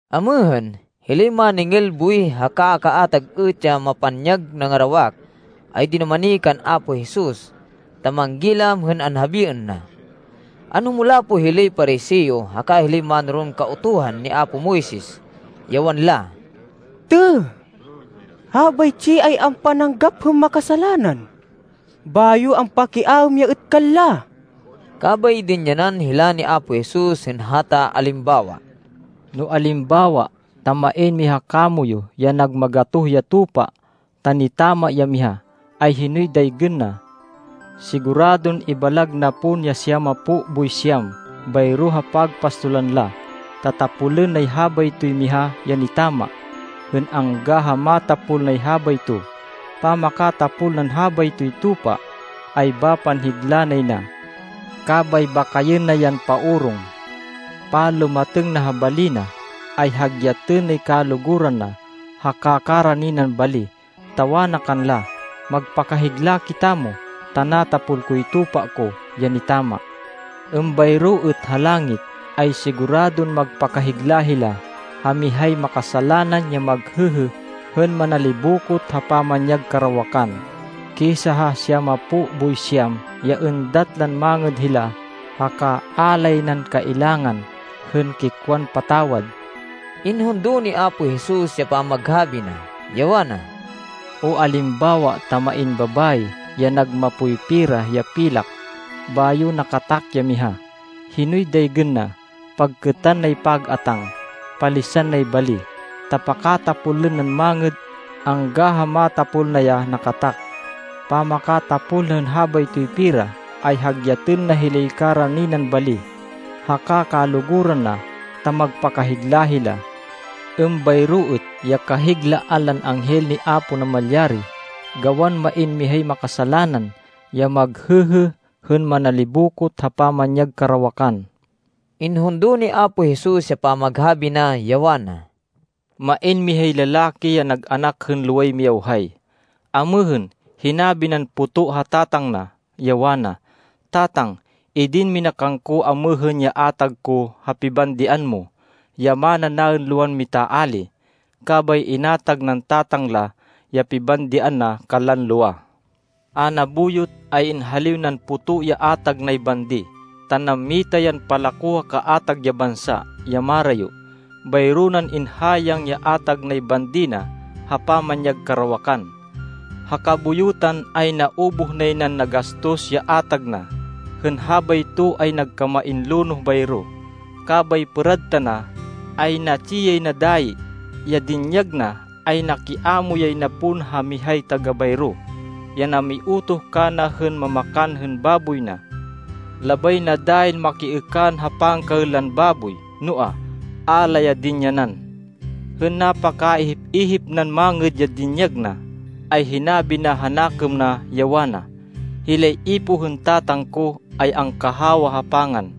Amêhên, hilay máningil buwih haka kaatag êt ya mapanyag nangarawak, ay dinumani kan Apo Jesus ta manggilam hên anhabiên na. Anhumulapo hilay Pariseo haka hilay mánoron Kautuhan ni apo Moises, ya wanla, “Têh! Habaytsi ay ampananggap hên makasalanan, bayo ampakiaêm ya êt kanla!” Kabay dinyanan hila ni Apo Jesus hên hata alimbawa, “No alimbawa ta main miha kamoyu ya nag magatoh ya tupa, ta nitama ya miha, ay hinoy daygên na? Siguradon ibalag na pon ya siyamapo boy siyam bayro ha pagpastolan la, ta tapolên nay habaytoy miha ya nitama hên angga ha matapol nay habayto. Pamakatapol nan habaytoy tupa, ay bapan higla nay na. Kabay bakayên na yan paorong. Panlumatêng na ha bali na, ay hagyatên nay kaluguran na haka karani nan bali, ta wana kanla, ‘Magpakahigla kitamo, ta natapol koy tupa ko ya nitama.’ Êmbayro êt ha langit, ay siguradon magpakahigla hila ha mihay makasalanan ya maghêhê hên manalibokot ha pamanyag karawakan, kisa ha siyamapo boy siyam ya êndat lan mangêd hila haka a lay nan kailangan hên kikwan patawad.” Inhundo ni Apo Jesus ya pamaghabi na, ya wana, “O alimbawa ta main babayi ya nag mapoy pera ya pilak, bayo nakatak ya miha, hinoy daygên na? Pagkêtan nay pag-atáng, palisan nay bali, ta pakatapolên nan mangêd angga ha matapol na ya nakatak. Pamakatapol na hên habaytoy pera, ay hagyatên na hilay karani nan bali, haka kaluguran na ta magpakahigla hila. Êmbayro êt ya kahiglaan lan anghel ni Apo Namalyari, gawan main mihay makasalanan ya maghêhê hên manalibokot ha pamanyag karawakan.” Inhundo ni Apo Jesus ya pamaghabi na, ya wana, “Main mihay lalaki ya nag anak hên loway miyawhay. Amêhên, hinabi nan poto ha tatang na, ya wana, ‘Tatang, idin mina kangko amêhên ya atag ko ha pibandian mo, ya mana naên lowan mitaali.’ Kabay inatag nan tatang la ya pibandian na kanlan lowa. A nabuyot, ay inhaliw nan poto ya atag nay bandi, ta nammita yan palako ha kaatag ya bansa ya marayo. Bayro nan inhayang ya atag nay bandi na ha pamanyag karawakan. Ha kabuyutan, ay naubuh nay nan nagastos ya atag na. Hên habayto ay nagkamain lonoh bayro. Kabay pêrad tana, ay natsi yay na dayi. Ya dinyag na ay nakiamo yay na pon ha mihay taga-bayro ya namiutoh kana hên mamakan hên baboy na. Labay na dayin makiêkan ha pangkaên lan baboy, noa, a la ya dinyanan. Hên napakaihip-ihip nan mangêd ya dinyag na, ay hinabi na ha nakêm na, ya wana, ‘Hilay ipoh hên tatang ko ay angkahawa ha pangan,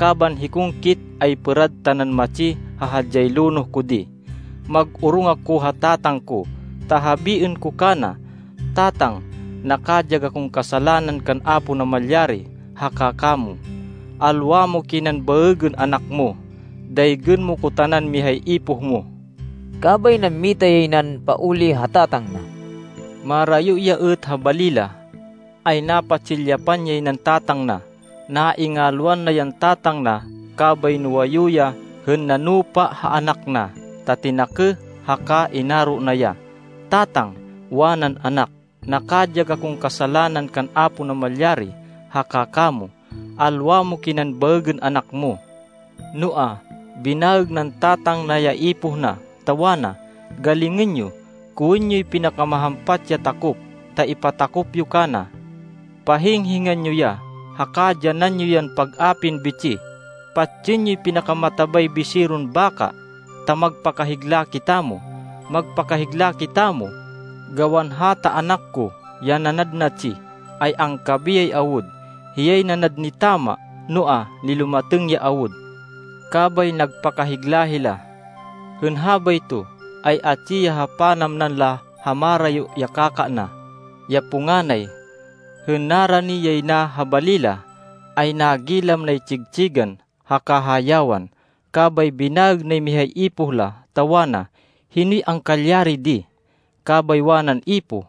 kaban hikong kit, ay pêrad tanan matsi ha hadyay lonoh ko di. Mag-orong ako ha tatang ko, ta habiên ko kana, “Tatang, nakadyag akon kasalanan kan Apo Namalyari haka kamo. Alwa mo kinan baêgên anak mo. Daygên mo ko tanan mihay ipoh mo.”’ Kabay nammita yay nan pauli ha tatang na. “Marayo ya êt ha bali la, ay napatsilyapan yay nan tatang na. Naingalwan na yan tatang na kabay nuwayu ya hên nanupa ha anak na, ta tinakêh haka inaro na ya. ‘Tatang,’ wanan anak, ‘nakadyag akon kasalanan kan Apo Namalyari haka kamo. Alwa mo kinan baêgên anak mo.’ Noa, binaêg nan tatang na ya ipoh na, ta wana, ‘Galingên yo. Kowên yoy pinakamahampat ya takop, ta ipatakop yo kana. Pahing-hingan yo ya haka dyanan yo yan pag-apin bitsih. Patsên yoy pinakamatabay biseron baka, ta magpakahigla kitamo! Magpakahigla kitamo, gawan hata anak ko ya nanad natsi, ay angkabiyay awud! Hiyay nanad nitama, noa, nilumatêng ya awud!’ Kabay nagpakahigla hila. “Hên habayto, ay atsi ya ha panamnan la ha marayo ya kaka na, ya punganay. Hên narani yay na ha bali la, ay nagilam nay tsig-tsigan haka hayawan. Kabay binaêg nay mihay ipoh la, ta wana, ‘Hinoy angkalyari di?’ Kabay wanan ipoh,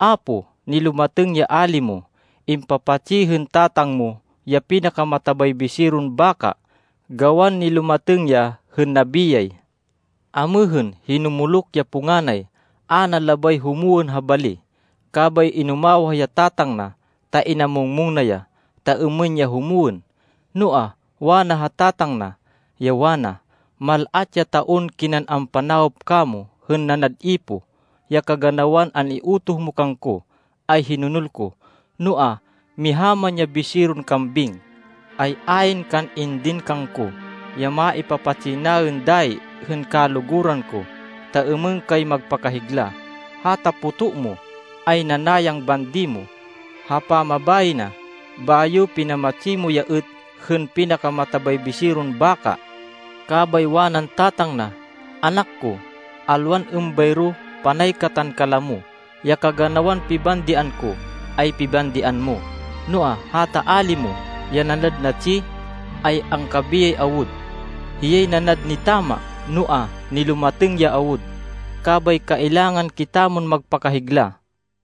‘Apo, nilumatêng ya ali mo. Impapatsi hên tatang mo ya pinakamatabay biseron baka, gawan nilumatêng ya hên nabiyay.’ Amêhên, hinumuluk ya punganay. A na labay humwên ha bali. Kabay inumawah ya tatang na, ta inamung-mung na ya, ta êmên ya humwên. Noa, wana ha tatang na, ya wana, ‘Mal-at ya taon kinan ampanawop kamo hên nanad ipoh. Ya kaganawan an-iutoh mo kangko, ay hinonol ko. Noa, miha man ya biseron kambing, ay ayn kan indin kangko ya maipapatsi naên dayi hên kaluguran ko, ta êmên kay magpakahigla. Hata poto mo, ay nanayang bandi mo ha pamabayi na, bayo pinamatsi mo ya êt hên pinakamatabay biseron baka!’ Kabay wanan tatang na, ‘Anak ko, alwan êmbayro. Panay katan kalamo. Ya kaganawan pibandian ko ay pibandian mo. Noa, hata ali mo ya nanad natsi, ay angkabiyay awud! Hiyay nanad nitama, noa, nilumatêng ya awud! Kabay kailangan kitamon magpakahigla.’”